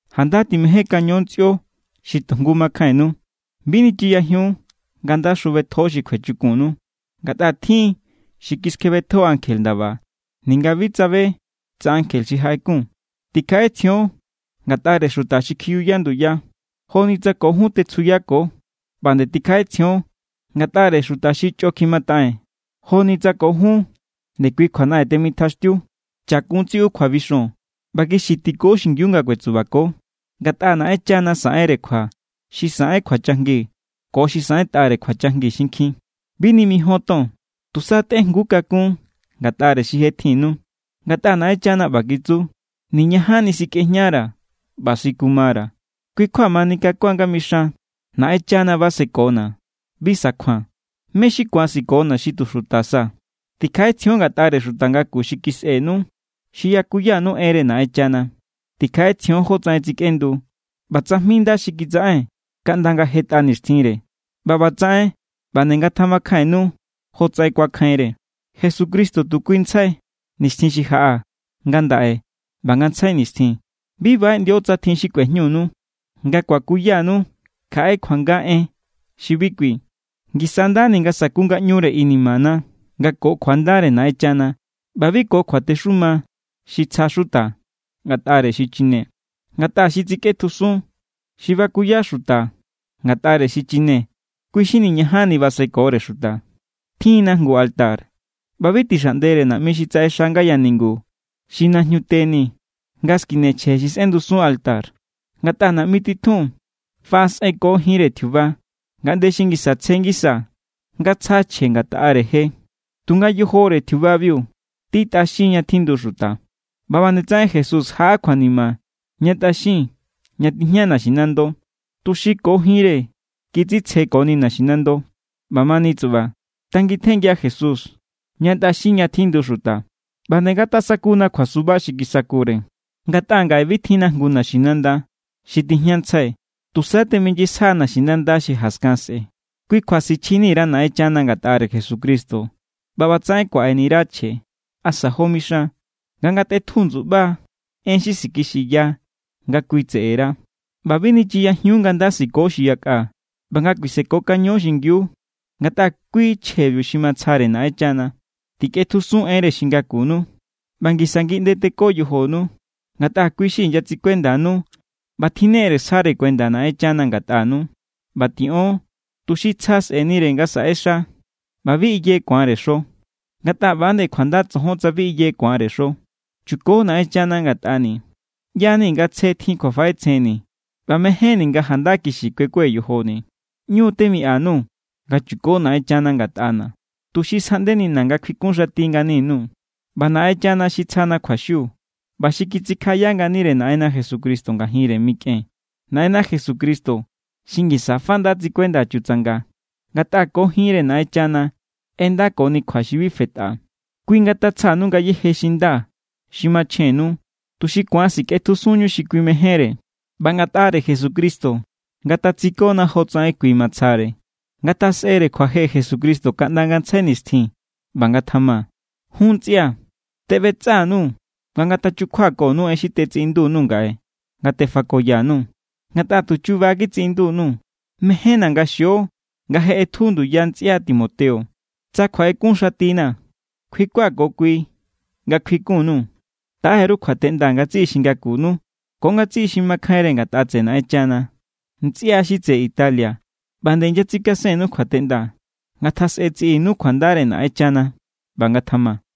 Janda timejénkaño ntsꞌio xi tu jngu makjainnu. Bi nichiyajiun nga nda xjubetjo xi kjuechukunnu, ngatꞌa tjin= xi kiskjebetjo ankje ndaba ninga bi tsabe tsa ankje xi jaꞌekun. Tikjaꞌetsjion ngatꞌare xuta xi kjiyuya nduya, joni tsa ko jun tetsjuyako. ꞌBa nde tikjaꞌetsjion ngatꞌare xuta xi chꞌo kjimataꞌen, joni tsa ko jun ndekui kjuanaꞌen temitjaxtiu. Chakun tsiꞌu kjuabixon ꞌba kixi tiko xingiu nga kuetsubako, ngatꞌa Naꞌenchana saꞌenre kjua xi saꞌen kjuachajngi ko xi saꞌentꞌare kjuachajngi xinkjin. Bi nimijíon ton, tusa tꞌejngu kakún ngatꞌare xi je tjinnu. Ngatꞌa Naꞌenchana ꞌba kitsu: “Niñajanni sikꞌejñara̱ ꞌba sikumara̱.” Kui= kjua mani kakuan nga mixan: Naꞌenchana basekona̱; bi sakjua̱n. ¿Mé= xi ku̱an sikona̱ xi tu xuta sa? Tikjaꞌetsjion ngatꞌare xuta ngaku xi kisꞌenu, xi yakuyanu enre Naꞌenchana. Tikjaꞌetsjion jótsaꞌen tsikꞌendu, ꞌba tsajmi nda xi kitsaꞌen kaꞌnda nga̱ jetꞌa nixtjinre, ꞌba ꞌbatsaꞌen ꞌba nde ngatjamakjainnu jotsaꞌen kuakjainre. Jesucristo tu kuintsjai, nixtjin xi jaꞌa, ngandaꞌe ꞌba ngantsjai nixtjin. Bi baꞌeꞌndio tsa tjin xi kꞌuejñunu nga kuakuyanu kjaꞌe kjuanga en xi bi kui. Ngisa= ndani nga saku ngaꞌñure inimana nga ko kjuandare Naꞌenchana ꞌba bi ko kjuatexuma xi tsja xuta ngatꞌare xichine. Ngatꞌa xi tsikꞌetjusun xi bakuya xuta ngatꞌare xichine, kui= xi niñajanni basekore xuta. Tjin=na jngu altar, ꞌba bi tixaꞌndere naꞌmi xi tsaꞌexa ngaya ningu xi najñute ni nga skine chje xi sꞌendusun alto. Ngatꞌa naꞌmi titjun faꞌasꞌenko jinre tjiuba ngaꞌnde xi ngisa tsje ngisa nga tsja chje ngatꞌare je, tunga yojore tjiubabiu tí tꞌaxin ña tjindu xuta. ꞌBa ꞌba nde tsaꞌen Jesús jaꞌa kjuanima ña tꞌaxin ña tijña naxinando, tuxi ko jinre kitsitsjekoni naxinando. ꞌBamani tsuꞌba, tangitjenngia Jesús ña tꞌaxin ña tjindu xuta, ꞌba nde ngatasakuna kjuasuba xi kisakure. Ngatꞌa ngaꞌe bi tjinna jngu naxinanda xi tijñantsjai, tusa teminyisja naxinanda xi jaskan sꞌe̱. Kui kjua sichjintsjaini_ra Naꞌenchana ngatꞌare Jesucristo ꞌba ꞌbatsaꞌen kuaꞌeni_ra chje. Asa jo mixan, nga ngatꞌetju ndsuꞌba en xi sikixiya nga kui tseꞌera. ꞌBa bi nichiyajiun nga nda siko xi yakꞌa ꞌba nga kuisekokaño xingiu, ngatꞌa kui chjebiu xi matsjare Naꞌenchana. Tikꞌetjusun enre xi ngakunu ꞌba ngisa ngiꞌnde teko yojonu, ngatꞌa kui xi inyatsikuendanu ꞌba tjinnere sjare kuenda Naꞌenchana ngatꞌanu. ꞌBa tiꞌon tuxi tsja sꞌe̱nire nga saꞌexa ꞌba bi iye ku̱anre xo, ngatꞌa ꞌba=nde kjuanda tsojon tsa bi iye ku̱anre xo. Chuko Naꞌenchana ngatꞌani̱. ꞌYa=ni̱ nga tsje tjin kjuafaꞌetsjenni̱ ꞌba mejénni̱ nga janda kixi kuekue̱ yojoni̱. ꞌÑu temiꞌa_nuu̱ nga chuko Naꞌenchana ngatꞌana̱, tuxi sjaꞌndenina̱ nga kjuikunxati ngani_nuu̱. ꞌBa Naꞌenchana xi tsjana kjuaxiu ꞌba xi kitsikjaꞌaya nganire Naꞌenna Jesucristo ngajinre mikꞌen. Naꞌenna Jesucristo xi ngisa fa nda tsikuenda chutsanga, ngatꞌa ko jinre Naꞌenchana ꞌendakoni kjua xi bi fetꞌa. Kui ngatatsjanu ngayéje xi nda xi machjennu, tuxi ku̱an sikꞌetjusunñu xi kui mejénre, ꞌba ngatꞌare Jesucristo ngatatsikona jotsaꞌen kui matsjare. Ngatjasꞌere kjuaje Jesucristo kaꞌnda ngantsjai nixtjin. ꞌBa ngatjama. Jun ntsꞌia̱, teꞌbetsꞌa_nuu̱ nga ngatachukjuakonu en xi tetsiꞌindu_nuu̱ ngaꞌe nga tefakoya_nuu̱, ngatꞌa tu chuba kitsiꞌindu_nuu̱. Mejénna̱ nga xio nga je ꞌetju nduya ntsꞌia Timoteo. Tsa kjuaꞌekunxatina̱, kjuikua̱ ko kui nga kjuikun_nuu̱. Taꞌe_ru kjuateꞌnda ngatsiꞌi xi ngakunu ko ngatsiꞌi xi makjainre ngatꞌa tseꞌe Naꞌenchana. Ntsꞌia xi tseꞌe Italia ꞌba nde inyatsikasennu kjuateꞌnda. Ngatjasꞌe tsiꞌinu kjuandare Naꞌenchana. ꞌBa ngatjama.